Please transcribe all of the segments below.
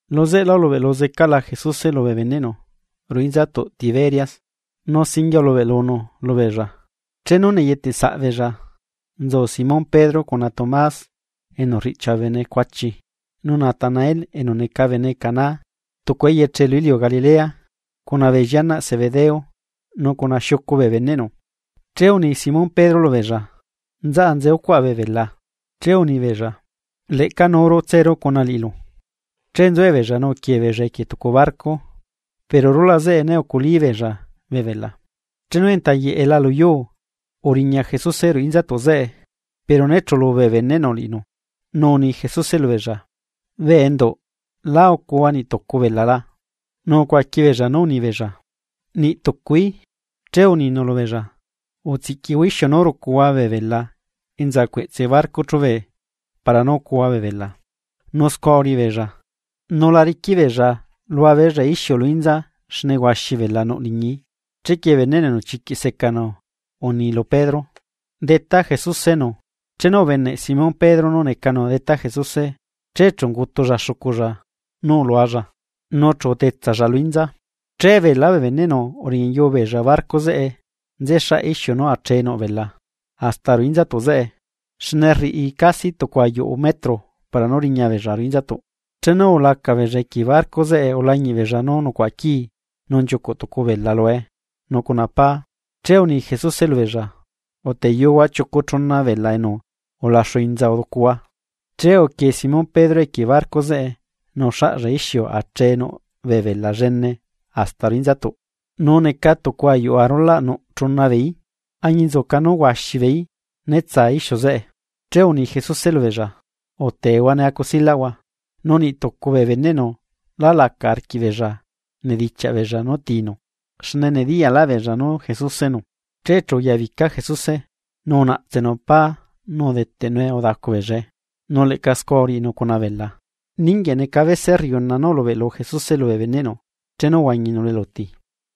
Lu zeꞌe lá, ulubeꞌlu zecaꞌla Jesuse lubee beneꞌnu ruꞌu inzatuꞌ Tiberias, nu singuie ulubeꞌlunu lubeella: Chenu neyeteꞌsaꞌ beella, nzu Simón Pedro, cuna Tomás enu rriꞌchia bee bene cuachi, nu Natanael enu neca bene Caná tucu eyeche lu iliu Galilea cuna bee llianaꞌ Zebedeo nu cuna xiucu bee beneꞌnu. Che uni Simón Pedro lubeella: ―Nzaꞌa nze ucuaꞌa bee bela. Che unibeella: ―Leꞌca nuuru tseru cuna liꞌilu. Che nzuebeella nu uquie beella equie tucu barco, pero rulaꞌ zeꞌe né uculí beella bee bela. Chenu enta yeꞌela lu yuu, uriña Jesuse ruꞌu inzatuꞌ zeꞌe, pero né chulu bee beneꞌnu liꞌinu. Nu uni Jesuse lubeella: ―Bee enduꞌ, ¿lá ucuhua niꞌ tucu bela la? Nu ucuaqui beella nú uni beella: ―Niꞌ tucuí. Che uninu lubeella: ―Utsiꞌquihua ixiu nú rucuhua bee bela enza cueꞌtse barco chubee para nú ucuhua bee bela. Nu scua uriꞌi beella, nu la riquiꞌa beella lua beella ixiu lu inza, xne huaxi bela nuꞌ liñii. Chequie beneꞌnu enu chiquiꞌ secanu uni lu Pedro: ―¡Detá Jesusenu! Chenu ubeneꞌ Simón Pedro nú necanu Detá Jesuse che chu ungutulla xuculla nú ulualla, nu chu utetsalla lu inza. Che beelá bee beneꞌnu uriñayuu beella barco zeꞌe nú nzexaꞌ ixiu nú achee nú bela hasta ruꞌu inzatuꞌ, xne rriꞌi casi tucu ayuꞌu metro para nú riña beella ruꞌu inzatuꞌ. Chenu ulaca beella equie barco zeꞌe ulañiꞌ beella nú nucuaꞌa quii nu nchiucuꞌ tucu bela lue, nu cuna pá. Che uni Jesuse lubeella: ―Uteyuhua chiucu chuna bee bela enu ulaxu inza uducuhua. Che uquie zeca Simón Pedro equie barco zeꞌe nu uxaꞌlla ixiu nú achee nuꞌ bee bela llene hasta ruꞌu inzatuꞌ, nu neca tucu ayuꞌu arulaꞌ nuꞌ chuna beeí, añinzuca nú huaxi beeí né tsa ixiu zeꞌe. Che uni Jesuse lubeella: ―Utehua ne acusilaꞌhua. Nu niꞌtucu bee beneꞌnu lá laca arquiꞌ beella anedichiaꞌ beella nú tinu, xne nediyaꞌlaꞌ beella nú Jesusenu. Che chu uyabica Jesuse, nu unaꞌtsenu pá nu udeteꞌnue udacu beellae, nu leꞌca scua uriꞌinu cuna bela. Ninguieꞌ neca bese rriuna nú ulubeꞌlu Jesuse lubee beneꞌnu chenu uhuañi zecanu lu eluti.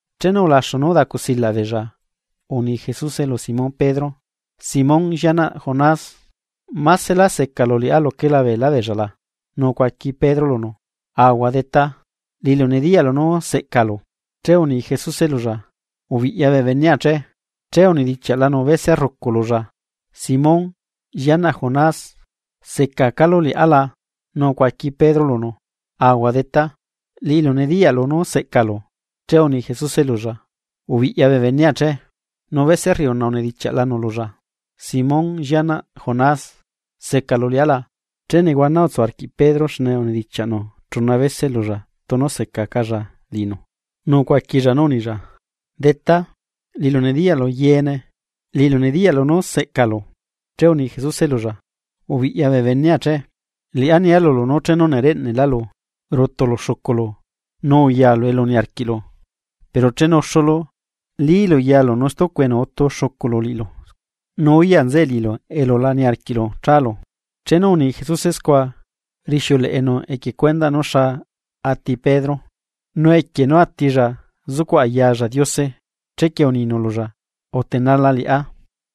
Chenu ulaxu nú udacusilaꞌ beella, uni Jesuse lu Simón Pedro: ―Simón, llianaꞌ Jonás, ¿másela secalu liꞌá luquela beelá beella la? Nu ucuaqui Pedro lunu: ―Ahuaꞌ, Detá, liꞌilu nediyaꞌlu nú seꞌcalu. Che uni Jesuse lulla: ―Ubiꞌya bee benea che. Che unedichiaꞌlanu bese rrucu lulla: ―Simón, llianaꞌ Jonás, ¿secacálu liꞌá la? Nu ucuaqui Pedro lunu: ―Ahua, Detá, liꞌilu nediyaꞌlu nú seꞌcalu. Che uni Jesuse lulla: ―Ubiꞌya bee benea che. Nu bese rriuna unedichiaꞌlanu lulla: ―Simón llianaꞌ Jonás, ¿secalu liꞌá la? Che nehuana utsu arquiꞌ Pedro xne unedichiaꞌnu chuna bese lulla tunu secacalla liꞌinu, nu ucuaquilla nú unilla: ―Detá, liꞌilu nediyaꞌlu yeene. Liꞌilu nediyaꞌlu nú seꞌcalu. Che uni Jesuse lulla: ―Ubiꞌya bee benea che. Liꞌá rnia lulu nú chenu nereꞌneꞌlálu, rutulu xuculu nu nzalu elu niarquiꞌlu, pero chenu uxulu lílu yalu nu stucu bene utu xuculu liꞌilu nu uyaꞌ nzeꞌe liꞌilu elu la niarquiꞌlu chálu. Chenu uni Jesuse scua, rixiuleꞌenu equie cuendaꞌ nú xa ati Pedro, nu equie nú atilla zucuꞌ ayalla Diose. Chequie uninu lulla: ―Utenala liꞌá.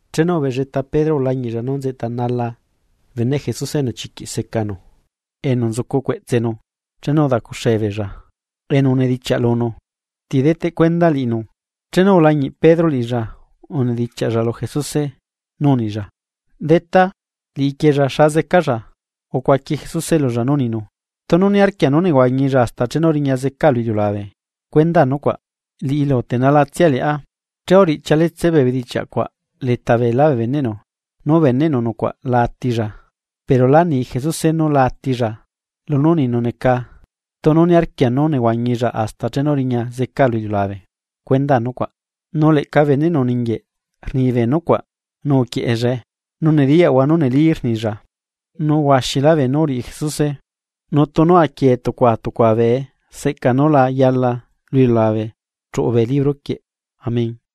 Chenu ubelleta Pedro ulañiꞌlla nú nzeꞌtanala beneꞌ Jesuse enu chiquiꞌ secanu liꞌibeella, enu uzucu cueꞌtsenu chenu udacuxee beella enu unedichiaꞌ lunu: “Nu ti deteꞌ cuenda liꞌinu.” Chenu ulañiꞌ Pedro liꞌilla unedichiaꞌlla lu Jesuse nú unilla: ―Detá, liꞌiquiella ¿xa zecalla? Ucuaqui Jesuse lulla nú uninu: ―Tunu niarquia nú nehuañilla hasta chenu riña zecaa lu iliulabe, cuenda nucuaꞌ. Liꞌilu utenalatsia liꞌá. Che urichialetse bee bedichiaꞌ cuaꞌ leta beelá bee beneꞌnu, nú beneꞌnu nucuaꞌ la atilla. Pero lá ni Jesuse nú la atilla. Lunú uninu neca: “Tunu niarquia nú nehuañilla hasta chenu riña zecaa lu iliulabe, cuenda nucuaꞌ.” Nu leꞌca beneꞌnu ninguieꞌ rni bee nucuaꞌ nu uquieꞌellae. Nu nediyaꞌahua nú neli rnilla. Nu huaxilá beenú uriꞌi Jesuse nu tunu quiee tucua tucua bee seꞌca nú la yala lu iliulabe chuꞌu bee libro quieꞌ. Amén.